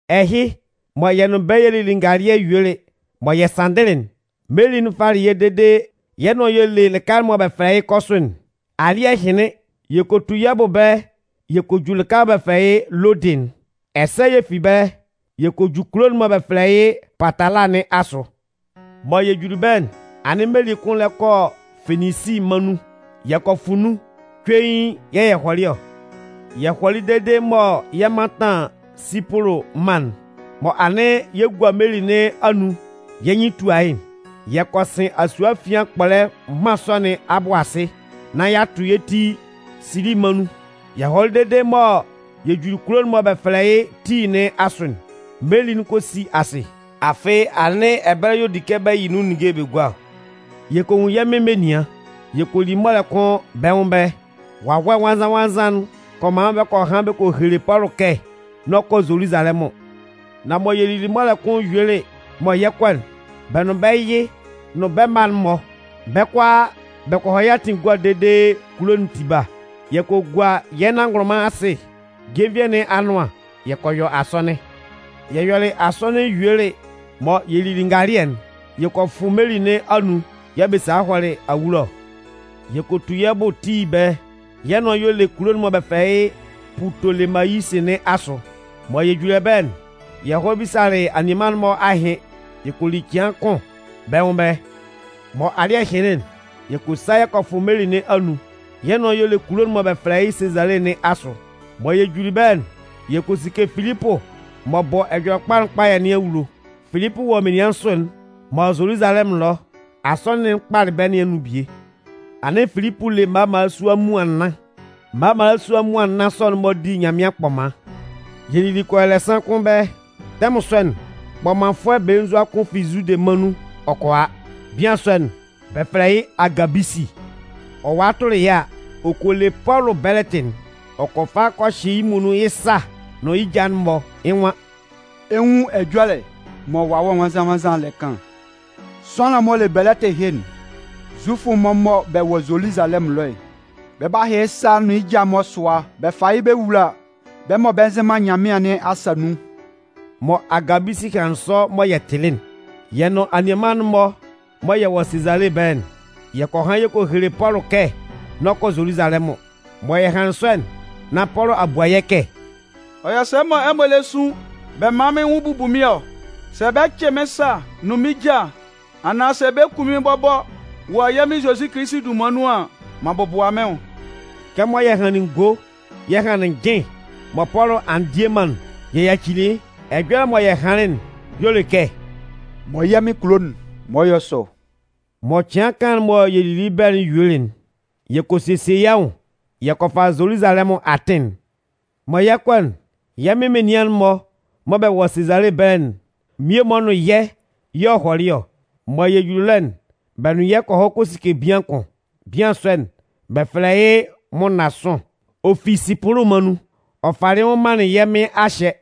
Ɛhɩ, mɔ yɛ nʋn bɛ́ yɛ lili ngalɩɛ yuelɩ mɔ yɛ sanndɩlɩ'n, meli'n falɩ yɛ́ fɔ́ʋ́n dede yɩ́ nʋan y'ɔ le lɩka'n mɔ bɛ fɛlɛ yɩ́ Kɔsʋ'n. Alɩ́ɛ hɩnlɩn, yɛ kɔ tu yɛ́ bʋ ɛbɛlɛ yɛ kɔ ju lɩka'n mɔ bɛ fɛlɛ yɩ́ Lodɩ'n. Ɛsɛ yɛ fi ɛbɛlɛ, yɛ kɔ ju kulo'n mɔ bɛ fɛlɛ yɩ́ Patala nɩn asʋ. Mɔ yɛ juli ɛbɛlɛ'n, anɩn meli kʋn lɛ kɔ Feninsi mân nun. Yɛ kɔ fʋ nun, cuein yɛ̂ yɛ hɔlɩ ɔ. Yɛ hɔlɩ dede mɔ yɛ 'mantan Sipʋlʋ mân'n, mɔ anɩn yɛ gua meli nɩn anun yɛ́ nyɩn tua yɩ́'n, yɛ kɔ sɩn asue afian kpɔlɛ mân sɔ nɩn abʋ asɩ nán y'a tʋ yɛ́ ti Sili mân nun. Yɛ hɔlɩ dede mɔ yɛ juli kulo'n mɔ bɛ fɛlɛ yɩ́ Tii nɩn asʋ'n, meli'n kɔ si asɩ. Afɩ anɩn ɛbɛlɛ y'ɔ di kɛ bɛ yɩ nun ninnge'n bɛ gua ɔ. Yɛ kɔ nwun yɛ́ Mɩn menian, yɛ kɔ li mɔlɛ kʋn bɛ́ nwʋn ɛbɛlɛ. Wawɛ Nwannzan-nwannzan'n kɔ man bɛ kɔ han bɛ kɔ hele Pɔlʋ kɛ n'ɔ kɔ Zoluzalɛmʋn. Nan mɔ yɛ lili mɔlɛ kʋn yuelɩ mɔ yɛ 'kɔ'n, bɛ nʋn bɛ́ yɩ nʋn bɛ́ mma'n-mɔ, bɛ́ kʋalaa bɛ kɔ hɔ yɛ́ atɩn egua dede kulo'n tiba. Yɛ kɔ gua yɛ́ nanngʋnlʋnman asɩ jenvie nɩn anʋan yɛ kɔ yɔ asɔnɩn. Yɛ yɔlɩ asɔnɩn yuelɩ mɔ yɛ lili ngalɩɛ'n, yɛ kɔ fʋ meli nɩn anun yɛ̂ bɛ salɩ hɔlɩ awulo ɔ. Yɛ kɔ tu yɛ́ bʋ Tii ɛbɛlɛ, yɛ́ nʋan y'ɔ le kulo'n mɔ bɛ fɛlɛ yɩ́ Pʋtolemayisi nɩn asʋ. Mɔ yɛ juli ɛbɛlɛ'n, yɛ hɔlɩ bisalɩ anianman'n-mɔ ahɩn yɛ kɔ li cɩan kʋn bɛ́ nwʋn ɛbɛlɛ. Mɔ alɩ́ɛ hɩnlɩn'n, yɛ kɔ sa yɛ kɔ fʋ meli nɩn anun, yɛ́ nʋan y'ɔ le kulo'n mɔ bɛ fɛlɛ yɩ́ Sezale nɩn asʋ. Mɔ yɛ juli ɛbɛlɛ'n, yɛ kɔ sike Filipʋ m'ɔ bɔ Ɛjɔlɛkpa'n kpayɛ nɩn awulo. Filipʋ wɔ menian nsʋ'n mɔ Zoluzalɛmʋn ɛlɔ asɔnɩn'n kpalɩ bɛ́ nɩn anun bie. Anɩn Filipʋ le mma mmalasua muan nnan. Mma mmalasua muan nnan sɔ'n-mɔ di Nyanmɩan kpɔman. Yɛ lili kɔ yɔ ɛlɛsan kʋn ɛbɛlɛ. Tɛmʋn sɔ'n, kpɔmanfʋɛ belenzua kʋn fi Zude mân nun ɔ kɔ a. Bian sɔ'n, bɛ fɛlɛ yɩ́ Agabisi. Ɔ walɩ tʋlɩ yɛ́ a, ɔ kɔ le Pɔlʋ bɛlɛtɩ'n. Ɔ kɔ fa kɔ hyɩ yɩ́ muonun yɩ́ sa nʋn yɩ́ ja'n-mɔ. Yɩ́ nwan: “Ɛ 'nwun ɛjɔlɛ mɔ Wawɛ Nwannzan-nwannzan'n lɛ kan'n: ‘Sʋanlan'n m'ɔ le bɛlɛtɩ ɛhɩ'n, Zufʋ'n-mɔ mɔ bɛ wɔ Zoluzalɛmʋn ɛlɔ'n, bɛ 'ba hyɩ yɩ́ sa nʋn yɩ́ ja'n-mɔ sʋa bɛ fa yɩ́ bɛ wula bɛ́ mɔ bɛ nzɩ man Nyanmɩan nɩn asa nun.’” Mɔ Agabisi hanlɩn sɔ mɔ yɛ tɩlɩ'n, yɛ nʋn anianman'n-mɔ mɔ bɛ wɔ Sezale ɛbɛlɛ'n, yɛ kɔ han yɛ kɔ hele Pɔlʋ kɛ n'ɔ kɔ Zoluzalɛmʋn. Mɔ yɛ hanlɩn sɔ'n, nán Pɔlʋ a bua yɛ́ kɛ: “Ɔ yɔ sɛ mɔ ɛmɔ lɛ sun bɛ man mɩ́n nwʋn bubu mɩ́n ɔ? Sɛ bɛ 'cɩ mɩ́n sa nʋn mɩ́n ja, anaan sɛ bɛ 'kun mɩ́n bɔbɔ wɔ yɛ́ Mɩn Zozi dunman nun an, m'an bɔbʋa mɩ́n nwʋn.” Kɛmɔ yɛ hanlɩn ngo yɛ hanlɩn njɩn mɔ Pɔlʋ a ndie man'n, yɛ yacili yɩ́. Ɛjɔlɛ mɔ yɛ hanlɩn'n y'ɔ le kɛ: “Mɔ yɛ́ Mɩn kulo'n, man ɔ yɔ́ sɔ!” Mɔ cɩan kaan'n mɔ yɛ lili yɩ́ ɛbɛlɛ'n yuelɩ'n, yɛ kɔ sesie yɛ́ nwʋn yɛ kɔ fa Zoluzalɛmʋn atɩn'n. Mɔ yɛ 'kɔ'n, yɛ́ Mɩn menian'n-mɔ mɔ bɛ wɔ Sezale ɛbɛlɛ'n mmie-mɔ nʋn yɛ́ yɛ̂ ɔ hɔlɩ ɔ. Mɔ yɛ juli ɛlɔ'n, bɛ nʋn yɛ́ kɔ hɔ kɔ sike bian kʋn. Bian sɔ'n, bɛ fɛlɛ yɩ́ Mʋnnasʋn. Ɔ fi Sipʋlʋ mân nun. Ɔ falɩ yɩ́ nwʋn manlɩn yɛ́ Mɩn a hyɛ.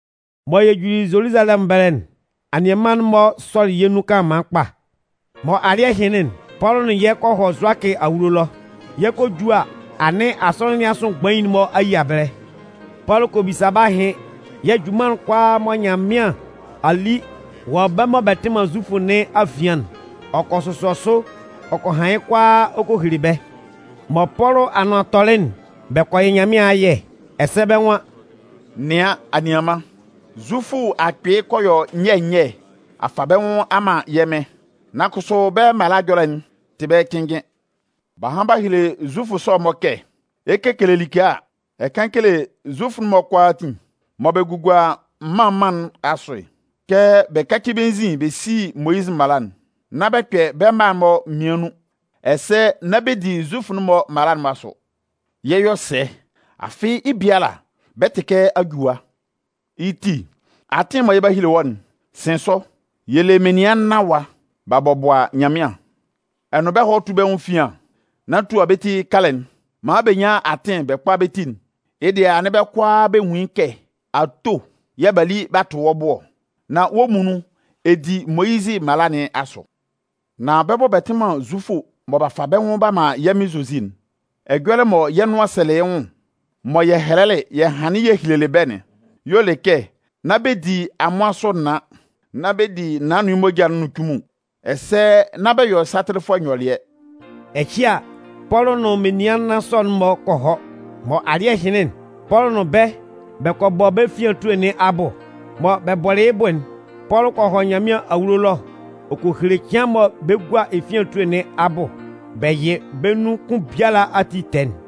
Mɔ yɛ juli Zoluzalɛmʋn ɛbɛlɛ'n, anianman'n-mɔ sɔlɩ yɛ́ nun kanlanman kpa. Mɔ alɩ́ɛ hɩnlɩn'n, Pɔlʋ nʋn yɛ kɔ hɔ Zʋakɩ awulo ɛlɔ. Yɛ 'kɔ a ju a, anɩn asɔnɩn nɩn asʋ mgbain'n-mɔ a yia ɛbɛlɛ. Pɔlʋ kɔ bisa bɛ́ ahɩn yɛ̂ junman'n kʋalaa mɔ Nyanmɩan a li wɔ bɛ́ mɔ bɛ tɩ man Zufʋ nɩn afian'n, ɔ kɔ sʋsɔ sʋ ɔ kɔ han yɩ́ kʋalaa ɔ kɔ hele bɛ́. Mɔ Pɔlʋ anʋan tɔlɩ'n, bɛ kɔ yɩ Nyanmɩan ayɛ, ɛsɛ bɛ́ nwan: “Nɩan, anianman, Zufʋ akpɩɩ kɔ yɔ nyɛ nyɛ a fa bɛ́ nwʋn a man yɛ́ Mɩn. Nan kʋsʋ, bɛ́ mala ɛjɔlɛ'n tɛ tɩ bɛ́ cɩnnjɩn. B'a han b'a hele Zufʋ sɔ'n-mɔ kɛ, ɛ 'kele like a, ɛ kan kele Zufʋ'n-mɔ kʋalaatin mɔ bɛ gugua mân mân'n-mɔ asʋ'n kɛ bɛ káci bɛ́ nzin bɛ sí Moyizɩ mala'n, nán bɛ kpɛ bɛ́ mma'n-mɔ mmian nun, ɛsɛ nán bɛ di Zufʋ'n-mɔ mala'n-mɔ asʋ. Yɛ 'yɔ sɛ? Afɩ, yɩ́ biala, bɛ 'tɩ kɛ a ju ɛwa. Yɩ́ ti, atɩn'n mɔ yɛ 'ba hele wɔ́'n, sɩn sʋ. Yɛ le menian nnan ɛwa, b'a bɔbʋa Nyanmɩan. Ɛ nʋn bɛ́ hɔ́ tú bɛ́ nwʋn efian nán tua bɛ́ ti kalɛ'n maan bɛ nyán atɩn bɛ kpá bɛ́ ti'n. Yɩ́ dɩɛ anɩn bɛ́ kʋalaa bɛ nwun yɩ́ kɛ ato yɛ̂ b'a li b'a tʋ wɔ́ bʋ ɔ, nán wɔ́ muonun ɛ di Moyizɩ mala nɩn asʋ. Nan bɛ́ mɔ bɛ tɩ man Zufʋ mɔ b'a fa bɛ́ nwʋn b'a man yɛ́ Mɩn Zozi'n, ɛjɔlɛ mɔ yɛ́ nʋan sɛlɩ yɩ́ nwʋn, mɔ yɛ hɛlɛlɩ yɛ hanlɩn yɛ hɛlɛlɩ bɛ́'n y'ɔ le kɛ nán bɛ di amʋan sʋ naan, nán bɛ di naan nʋn yɩ́ moja'n nʋn cunmun, ɛsɛ nán bɛ yɔ satɩlɩfʋɛ nyɔlɩɛ.” Ɛhɩ a, Pɔlʋ nʋn menian nnan sɔ'n-mɔ kɔ hɔ. Mɔ alɩ́ɛ hɩnlɩn'n, Pɔlʋ nʋn bɛ́ bɛ kɔ bɔ bɛ́ efian etue nɩn abʋ. Mɔ bɛ bɔlɩ yɩ́ bʋ'n, Pɔlʋ kɔ hɔ Nyanmɩan awulo ɛlɔ ɔ kɔ hele cɩan mɔ bɛ 'gua efian etue nɩn abʋ bɛ yɩ bɛ́ nun kʋn biala ati tɛɛ'n.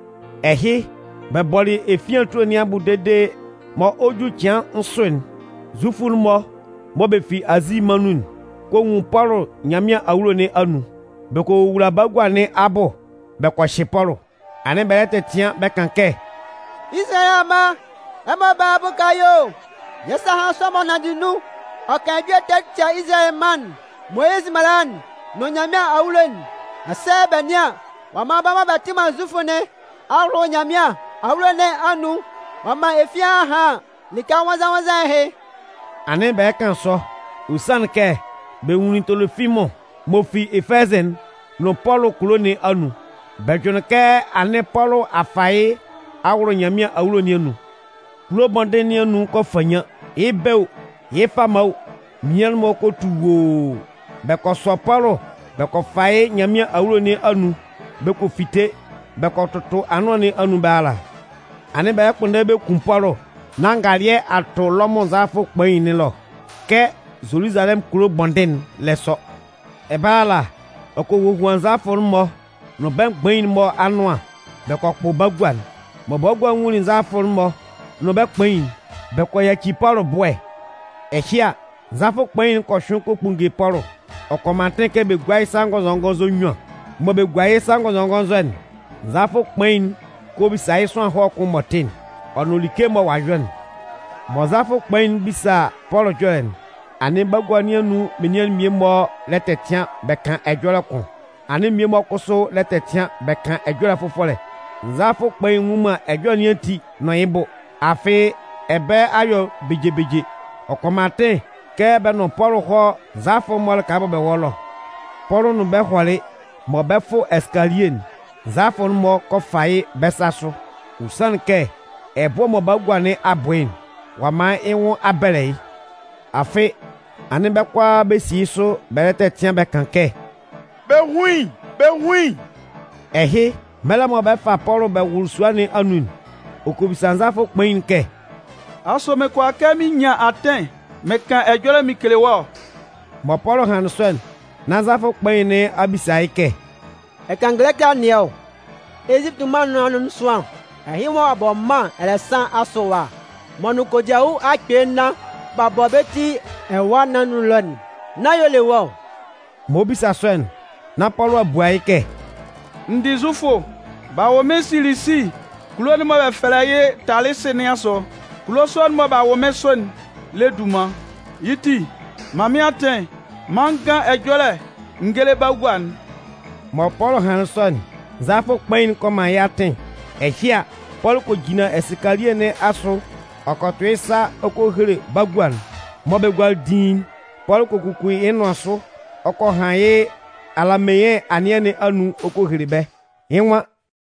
Ɛhɩ, bɛ bɔlɩ efian etue nɩn abʋ dede mɔ ɔ 'ju yɩ́ cɩan nsʋ'n, Zufʋ'n-mɔ mɔ bɛ fi Azi mân nun'n kɔ nwun Pɔlʋ Nyanmɩan awulo nɩn anun. Bɛ kɔ wowula bagua nɩn abʋ bɛ kɔ hyɩ Pɔlʋ. Anɩn bɛ lɛ tɛtɩan bɛ kan kɛ: “Izalayɛ amma, ɛmɔ bála a bʋka yɛ́ o! Yɛ́ sa a han sʋanlan'n m'ɔ nanndɩ nun ɔ kan ɛjɔlɛ ɛtɛ ɔ tia Izalayɛ mân'n, Moyizɩ mala'n nʋn Nyanmɩan awulo'n. Ɛsɛ bɛ nɩ́an, ɔ'a man bɛ́ mɔ bɛ tɩ man Zufʋ nɩn a wʋlʋ Nyanmɩan awulo nɩn anun ɔ'a man efian a han lɩka nwannzan-nwannzan ɛhɩ!” Anɩn bɛ lɛ kan sɔ, ɔ sanlɩn kɛ bɛ nwunlin Tolofimʋn m'ɔ fi Efɛzɩ'n nʋn Pɔlʋ kulo nɩn anun. Bɛ jʋnlɩn kɛ anɩn Pɔlʋ a fa yɩ́ a wʋlʋ Nyanmɩan awulo nɩn anun. Kulo bɔndɩn nɩn anun kɔ fannyan. Yɩ́ bɛ̂ o, yɩ́ fama o, menian'n-mɔ kɔ tu woo. Bɛ kɔ sɔ Pɔlʋ bɛ kɔ fa yɩ́ Nyanmɩan awulo nɩn anun bɛ kɔ fite bɛ kɔ tʋtʋ anʋan nɩn anun ɛbɛlɛ ala. Anɩn bɛ lɛ kpʋnndɛ bɛ kun Pɔlʋ, nán ngalɩɛ a tʋ Lɔmʋn nzalafʋ'n-mɔ kpain nɩn ɛlɔ kɛ Zoluzalɛmʋn kulo bɔndɩn'n lɛ sɔ. Ɛbɛlɛ ala, ɔ kɔ hohuan nzalafʋ'n-mɔ nʋn bɛ́ mgbain'n-mɔ anʋan bɛ kɔ kpʋ bagua'n. Mɔ bagua'n nwunlin nzalafʋ'n-mɔ nʋn bɛ́ kpain'n, bɛ kɔ yaci Pɔlʋ ɛbʋ́ɛ. Ɛhɩ a, nzalafʋ kpain'n kɔ hyʋɩn kɔ kpunnge Pɔlʋ, ɔ kɔ man atɩn kɛ bɛ gúa yɩ́ sa ngɔnzɔngɔnzɔ nnyuan. Mɔ bɛ gualɩ yɩ́ sa ngɔnzɔngɔnzɔ'n, nzalafʋ kpain'n kɔ bisa yɩ́ sʋanlan ɛhɔlɛ kʋn m'ɔ tɩ'n ɔ nʋn like mɔ ɔ'a yɔ'n. Mɔ nzalafʋ kpain'n 'bisa Pɔlʋ ɛjɔlɛ'n, anɩn bagua nɩn anun menian'n mmie-mɔ lɛ tɛtɩan bɛ kan ɛjɔlɛ kʋn, anɩn mmie-mɔ kʋsʋ lɛ tɛtɩan bɛ kan ɛjɔlɛ fʋfɔlɛ. Nzalafʋ kpain'n nnwun man ɛjɔlɛ nɩn ati nʋn yɩ́ bʋ, afɩ ɛbɛlɛ a yɔ beje beje. Ɔ kɔ man atɩn kɛ bɛ nʋn Pɔlʋ hɔ́ nzalafʋ'n-mɔ lɩka mɔ bɛ wɔ ɛlɔ. Pɔlʋ nʋn bɛ hɔlɩ mɔ bɛ fʋ ɛsɩkalie'n, nzalafʋ'n-mɔ kɔ fa yɩ́ bɛ sa sʋ. Ɔ sanlɩn kɛ ɛbʋ́ɛ mɔ bagua nɩn a bʋ yɩ́'n, ɔ'a man yɩ́ nwʋn a bɛlɛ yɩ́. Afɩ anɩn bɛ́ kʋalaa bɛ si yɩ́ sʋ bɛ lɛ tɛtɩan bɛ kan kɛ: “Bɛ hún yɩ́! Bɛ hún yɩ́!” Ɛhɩ, mɛlɛ mɔ bɛ 'fa Pɔlʋ bɛ wʋlʋ sua nɩn anun'n, ɔ kɔ bisa nzalafʋ kpain'n kɛ: “Asʋ mɩn kʋala kɛ mɩn nyan atɩn mɩn kan ɛjɔlɛ mɩn kele wɔ́ ɔ?” Mɔ Pɔlʋ hanlɩn sɔ'n, nán nzalafʋ kpain nɩn a bisa yɩ́ kɛ: “Ɛ kan Gɛlɛkɩ anɩɛ ɔ? Ezipiti mân nɩn anun sʋanlan ɛhɩ mɔ ɔ'a bɔ mân ɛlɛsan asʋ ɛwa, m'ɔ nʋn kodiawu akpɩɩ nnan b'a bɔ bɛ́ ti ɛwâ nɩn anun ɛlɔ'n, nán yɩ́ y'ɔ le wɔ́ ɔ?” M'ɔ bisa sɔ'n, nán Pɔlʋ a bua yɩ́ kɛ: “N dɩ Zufʋ, b'a wʋ mɩ́n Silisi kulo'n mɔ bɛ fɛlɛ yɩ́ Talɩsɩ nɩn asʋ. Kulo sɔ'n mɔ b'a wʋ mɩ́n sʋ'n lɛ dunman. Yɩ́ ti, man mɩ́n atɩn maan n gán ɛjɔlɛ n géle bagua'n.” Mɔ Pɔlʋ hanlɩn sɔ'n, nzalafʋ kpain'n kɔ man yɩ́ atɩn. Ɛhɩ a, Pɔlʋ kɔ jinlan ɛsɩkalie nɩn asʋ ɔ kɔ tʋ yɩ́ sa ɔ kɔ hele bagua'n. Mɔ bɛ gualɩ diin'n, Pɔlʋ kɔ kuku yɩ́ nʋan sʋ ɔ kɔ han yɩ́ alameɩn anɩɛ nɩn anun ɔ kɔ hele bɛ́. Yɩ́ nwan: